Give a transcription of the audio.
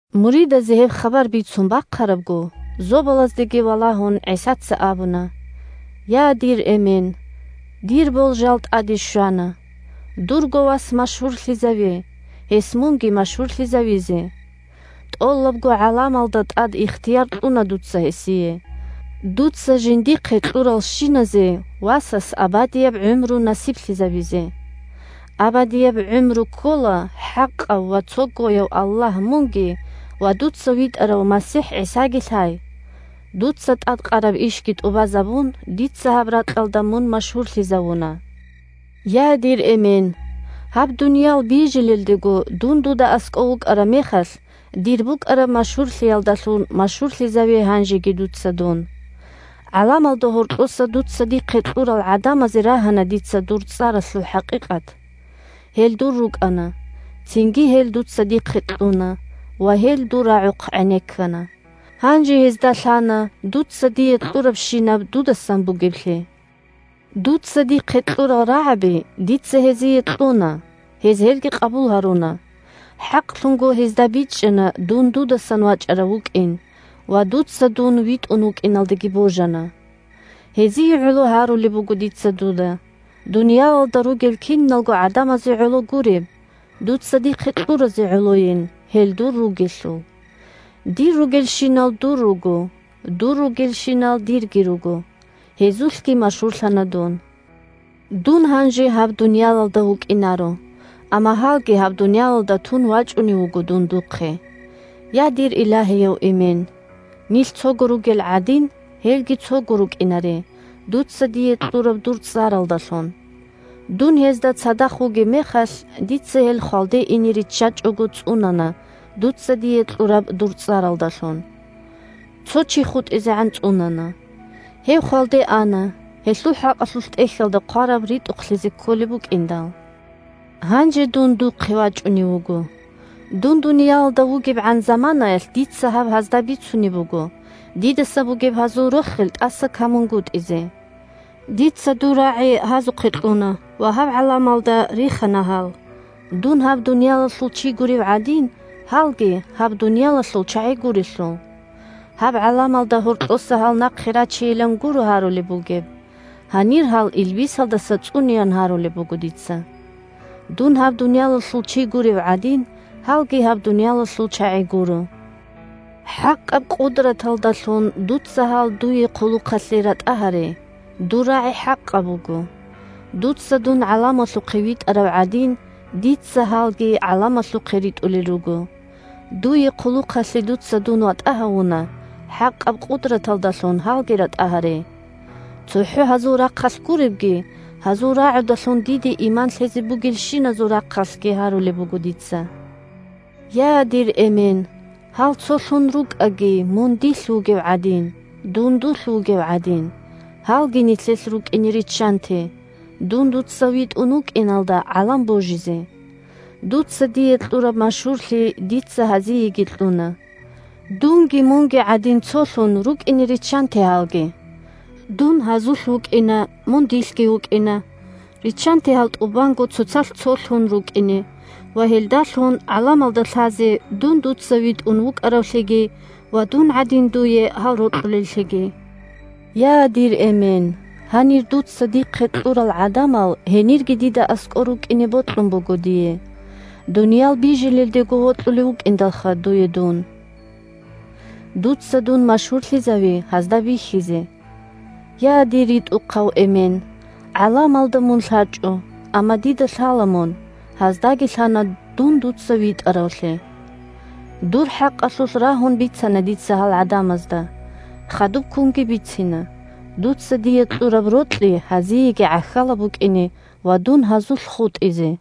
Муридазе гьеб хабар бицун бахъарабго, зобалаздеги валагьун, ГӀисаца абуна: – Я, дир Эмен! Дир болжал тӀаде щвана. Дурго Вас машгьурлъизаве, гьес мунги машгьурлъизавизе. ТӀолабго гӀаламалда тӀад ихтияр кьуна дуца гьесие, дуца жиндихъе кьуралщиназе Васас абадияб гӀумру насиблъизабизе. Абадияб гӀумру ккола ХӀакъав ва Цогояв Аллагь мунги ва дуца витӀарав МасихӀ ГӀисаги лъай. Дуца тӀадкъараб ишги тӀубазабун, дица гьаб ракьалда мун машгьурлъизавуна. Я, дир Эмен! Гьаб дуниял бижилелдего, дун дуда аскӀов вукӀараб мехалъ, дир букӀараб машгьурлъиялдалъун машгьурлъизаве гьанжеги дуца дун. ГӀаламалда гьоркьоса дуца дихъе кьурал гӀадамазе рагьана дица дур цӀаралъул хӀакъикъат. Гьел дур рукӀана, цинги гьел дуца дихъе кьуна ва гьел дур рагӀухъ гӀенеккана. Гьанже гьезда лъана дуца дие кьурабщинаб дудасан бугеблъи. Дуца дихъе кьурал рагӀаби дица гьезие кьуна, гьез гьел къабулги гьаруна. ХӀакълъунго гьезда бичӀчӀана дун дудасан вачӀарав вукӀин ва дун дуца витӀун вукӀиналдаги божана. Гьезие гӀоло гьарулеб буго дица дуда. Дуниялалда ругел киналго гӀадамазе гӀоло гуреб, дуца дихъе кьуразе гӀолойин, гьел дур ругелъул. Дир ругелщинал дур руго, дур ругелщинал дирги руго. Гьезулъги машгьурлъана дун. Дун гьанже гьаб дуниялалда вукӀинаро, амма гьалги гьаб дуниялалда тун вачӀунев вуго дун духъе. Я, дир Илагьияв Эмен! Нилъ цого ругел гӀадин, гьелги цого рукӀинаре, дуца дие кьураб дур цӀаралдалъун. Дун гьезда цадахъ вугеб мехалъ, дица гьел хвалде ине риччачӀого цӀунана дуца дие кьураб дур цӀаралдалъун. Цо чи хутӀизегӀан цӀунана. Гьев хвалде ана, гьелъул хӀакъалъулъ ТӀехьалда хъвараб ритӀухълъизе кколеб букӀиндал. Гьанже дун духъе вачӀунев вуго. Дун дуниялалда вугебгӀан заманаялъ дица гьаб гьазда бицунеб буго, дидаса бугеб гьазул рохел тӀаса камунгутӀизе. Дица дур рагӀи гьазухъе кьуна ва гьаб гӀаламалда рихана гьал, дун гьаб дуниялалъул чи гурев гӀадин, гьалги гьаб дуниялалъул чагӀи гурелъул. Гьаб гӀаламалда гьоркьоса гьал нахъе рачейилан гуро гьарулеб бугеб, гьанир гьал илбисалдаса цӀунеян гьарулеб буго дица. Дун гьаб дуниялалъул чи гурев гӀадин, гьалги гьаб дуниялалъул чагӀи гуро. ХӀакъаб къудраталдалъун дуца гьал дуе хъулухъалъе ратӀа гьаре. Дур рагӀи хӀакъаб буго. Дуца дун гӀаламалъухъе витӀарав гӀадин, дица гьалги гӀаламалъухъе ритӀулел руго. Дуе хъулухъалъе дуца дун ватӀа гьавуна, хӀакъаб къудраталдалъун гьалги ратӀа гьаре. ЦохӀо гьазул рахъалъ гуребги, гьазул рагӀудалъун диде иман лъезе бугелщиназул рахъалъги гьарулеб буго дица: Я, дир Эмен, гьал цолъун рукӀаги мун дилъ вугев гӀадин, – дун дулъ вугев гӀадин, гьалги нилъелъ рукӀине риччанте, – дун дуца витӀун вукӀиналда гӀалам божизе. Дуца дие кьураб машгьурлъи дица гьазиеги кьуна. Дунги Мунги гӀадин цолъун рукӀине риччанте гьалги. Дун гьазулъ вукӀина, мун дилъги вукӀина, риччанте гьал тӀубанго цоцалъ цолъун рукӀине ва гьелдалъун гӀаламалда лъазе дун дуца витӀун вукӀаравлъиги ва дун гӀадин дуе гьал рокьулеллъиги. Я, дир Эмен! Гьанир дуца дихъе кьурал гӀадамал гьенирги дида аскӀор рукӀине бокьун буго дие. Дуниял бижилелдего вокьулев вукӀиндалха дуе дун. Дуца дун машгьурлъизави гьазда бихьизе. Я, дир РитӀухъав Эмен! ГӀаламалда мун лъачӀо, амма дида лъала мун, гьаздаги лъана дун дуца витӀаравлъи. Дур хӀакъалъулъ рагьун бицана дица гьал гӀадамазда, хадубккунги бицина, дуца дие кьураб рокьи гьазиеги гӀахьалаб букӀине ва дун гьазулъ хутӀизе.